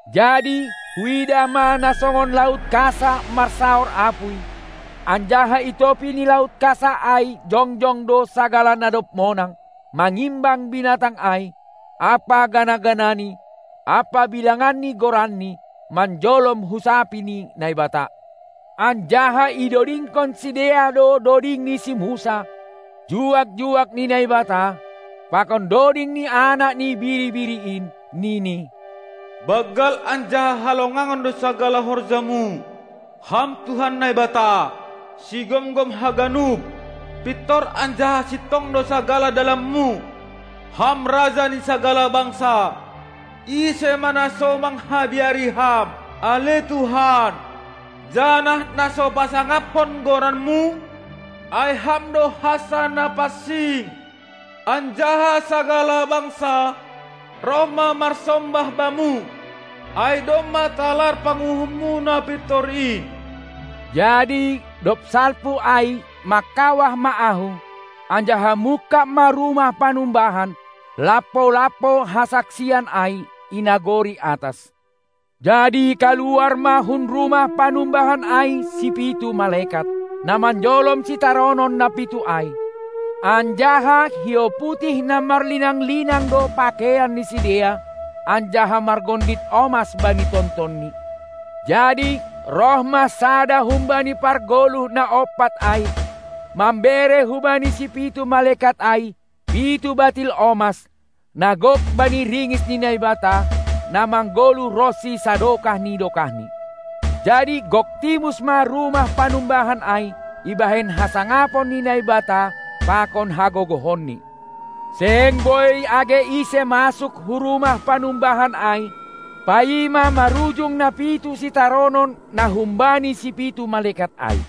Jadi huidah ma na songon laut kasa marsaor apuy, anjaha i topi ni laut kasa ai jongjong do sagala na dob monang mangimbang binatang ai ampa gana-ganani ampa bilangan ni goranni, manjolom husapi ni Naibata. Anjaha idodingkon sidea do doding ni si Musa, juak-juak ni Naibata, pakon doding ni Anak ni Biri-biri in, nini: Banggal anjaha halongangan do sagala horjamu, Ham Tuhan Naibata, Sigomgom haganup; pintor anjaha sintong do sagala dalanmu, Ham Raja ni sagala bangsa! Ise ma na so manghabiari Ham, ale Tuhan, janah na so pasangaphon goranMu? Ai Ham do hansa na pansing, anjaha sagala bangsa roh ma marsombah Bamu, ai domma talar panguhumMu na pintor in. Jadi dob salpu ai mangkawah ma ahu, anjaha mungkab ma rumah panumbahan, lampo-lampo hasaksian ai, i nagori atas. Jadi kaluar ma hun rumah panumbahan ai sipitu malekat, na manjolom sitaronon na pitu ai, anjaha hiou putih na marlinang-linang do pakeian ni sidea anjaha margondit omas bani tontonni. Jadi roh ma sada humbani pargoluh na ompat ai mambere hubani sipitu malekat ai pitu batil omas, na gok bani ringis ni Naibata, na manggoluh ronsi sadokah ni dokahni. Jadi gok timus ma rumah panumbahan ai ibahen hasangapon ni Naibata pakon hagogohonNi; seng boi age ise masuk hu rumah panumbahan ai, paima marujung na pitu sitaronon na humbani sipitu malekat ai.